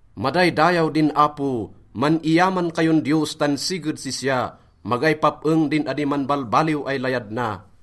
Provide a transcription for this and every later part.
Madaydayaw din Apo! Man-iyaman kayon Diyos tan siged sisya, magay pap-eng din adi manbalbaliw ay layad na.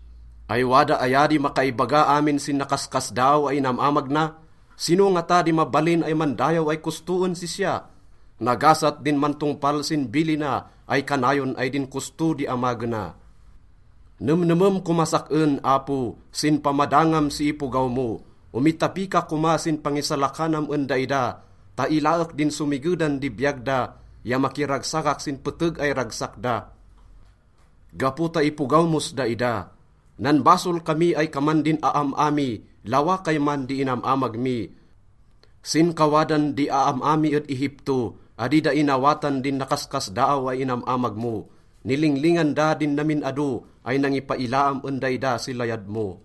Ay wada aya di makaibaga amin sin nakaskasdaaw ay inam-amag na? Sino ngata di mabalin ay mandayaw ay kosto en sisya? Nagasat din mantongpal sin bilina ay kanayon ay din kosto di amagena. Nemnemem komas sak-en, Apo, sin pamadangam si ipogaw mo. Omitapi ka koma sin pangisalakanam en daida ta ilaek din somigedan di biyag da ya makiragsakak sin peteg ay ragsak da gapo ta ipogaw mos daida. Nanbasol kami ay kaman din aam-a mi, lawa kayman di inam-amag mi. Sin kawadan di aam-a mi ed Egipto, adi da inawatan din nakaskasdaaw ay inam-amag mo. Nilinglingan da din namin ado ay nangipailaam en daida si layad mo.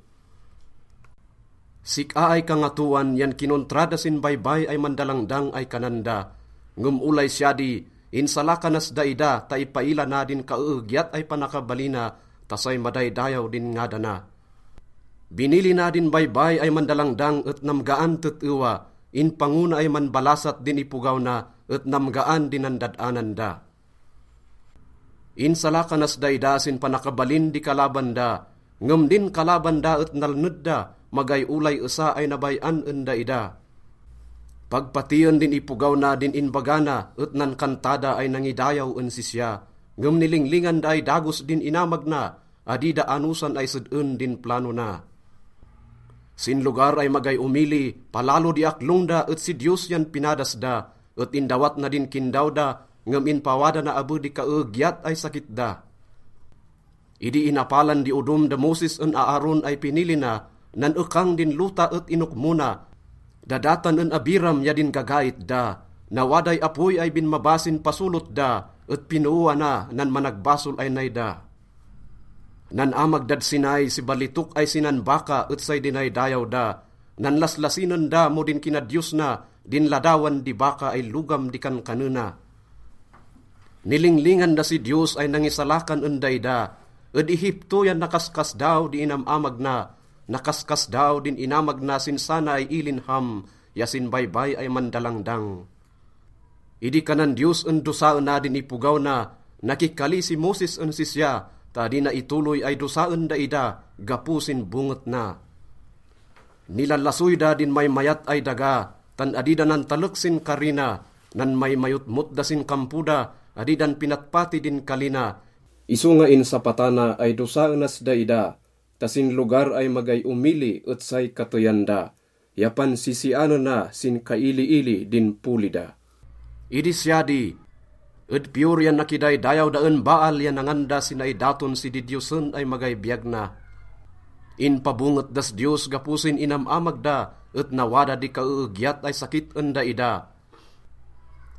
Sik-a ay Kangatoan yan kinontra da sin Baybay ay Mandalangdang ay kanan da. Ngem olay siya di, insalakanas daida ta ipaila na din kaeegyat ay panakabalina ta say madaydayaw din ngadana. Binilina din Baybay ay Mandalangdang et namgaan tet-ewa. Inpango na ay manbalasat din ipogaw na et namgaan di nandad-anan da. Insalakanas daida sin panakabalin di kalaban da. Ngem din kalaban da et nalned da, magay olay esa ay nabay-an en daida. Pag patien din ipogaw na din inbaga na et nankanta da ay nangidayaw en sisya. Ngem nilinglingan da ay dagos din inamag na, adi da anosan ay sed-en din plano na. Sin lugar ay magay omili, palalo di aklong da et si Diyos yan pinadas da. Et indawat na din kindaw da, ngem inpawada na abe di kaeegyat ay sakit da. Idi inapalan di odom da Moses en Aaron ay pinili na, nan-ekang din lota et inokmona da Datan en Abiram ya din gagait da. Nawaday apoy ay binmaba sin pasolot da, et pinooana nan managbasol ay nay da. Nan-amag dad Sinai si balitok ay sinan baka et say dinaydayaw da. Nanlaslasinen da mo din kinadiyos na din ladawan di baka ay logam di kankanena. Nilinglingan da si Diyos ay nangisalakan en daida, ed Egipto yan nakaskasdaaw di inam-amag na. Nakaskasdaaw din inamag na sin sana ay ilin Ham ya sin Baybay ay Mandalangdang. Idi kanan Diyos en dosaena din ipogaw na, nakikali si Moses en sisya ta adi na itoloy ay dosaen daida gapo sin bonget na. Nilalasoy da din maymayat ay daga, tan adi da nantalek sin kari na. Nanmaymayotmot da sin kampo da, adi dan pinatpati din kali na. Isonga insapata na ay dosaenas daida ta sin lugar ay magay omili et say kateyan da ya pansisianena sin kailiili din poli da. Idi siya di, ed Peor yan nakidaydayaw da en Baal ya nangan da si naidaton si didiyosen ay magay biyag na. Inpabonget das Diyos gapo sin inam-amag da, et nawada di kaeegyat ay sakit en daida.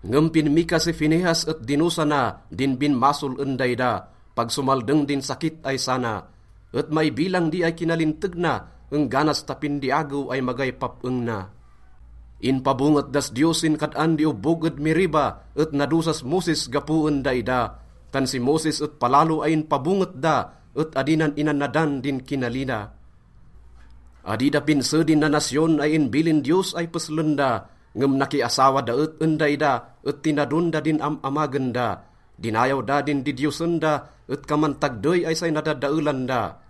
Ngem pinmika si Finehas et dinosa na din binmasol en daida, pag somaldeng din sakit ay sana. Et maibilang di ay kinalinteg na engganas tapin di agew ay magay pap-eng na. Inpabonget das Diyos sin kad-an di obbog ed Meriba et nadosas Moses gapo en daida. Tan si Moses et palalo ay inpabonget da et adi nan inannadan din kinali na. Adi da pinse din nanasyon ay inbilin Diyos ay peslen da, ngem nakiasawa da et en daida et tinadon da din am-amagen da. Dinayaw da din didiyosen da et kaman tagdey ay say nadadaelan da.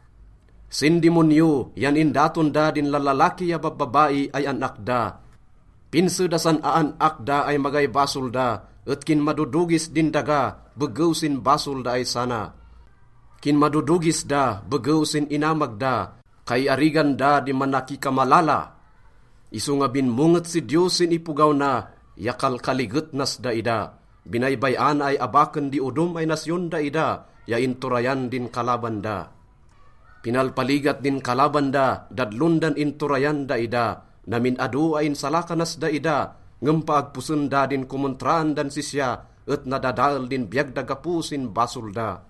Sin dimonyo yan indaton da din lallalaki ya babbabai ay an-ak da. Pinse da san aan-ak da ay magay basol da, et kinmadodogis din daga begew sin basol da ay sana. Kinmadodogis da begew sin inamag da, kaiarigan da di manakikamalala. Isonga binmonget si Diyos sin ipogaw na ya kalkaliget nas daida. Binaybay-ana ay abaken di odom ay nasyon daida ya inturayan din kalaban da. Pinalpaligat din kalaban da, dadlon dan inturayan daida. Namin ado ay insalakanas daida, ngem paagposen da din komontraan dan sisya et nadadael din biyag da gapo sin basol da.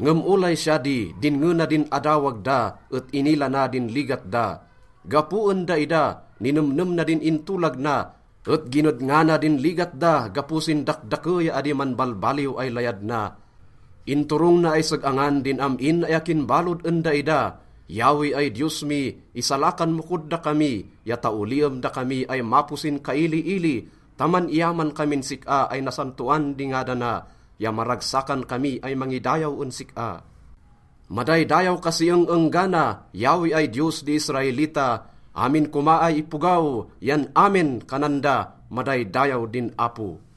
Ngem olay siya di, dinnge na din adawag da et inila na din ligat da. Gapo en daida, ninemnem na din intolag na, et ginedngana din ligat da gapo sin dakdake ya adi manbalbaliw ay layad na. Inturong na ay seg-angan din am-in ay akin balod en daida. Yahweh ay Diyos mi, isalakan mo kod dakami ya taoliem dakami ay mapo sin kailiili ta man-iyaman kamin sik-a ay nasantoan di ngadana ya maragsakan kami ay mangidayaw en sik-a. Madaydayaw ka si eng-enggana, Yahweh ay Diyos di Israelita. Amin koma ay ipogaw yan “Amen,” kanan da. Madaydayaw din Apo.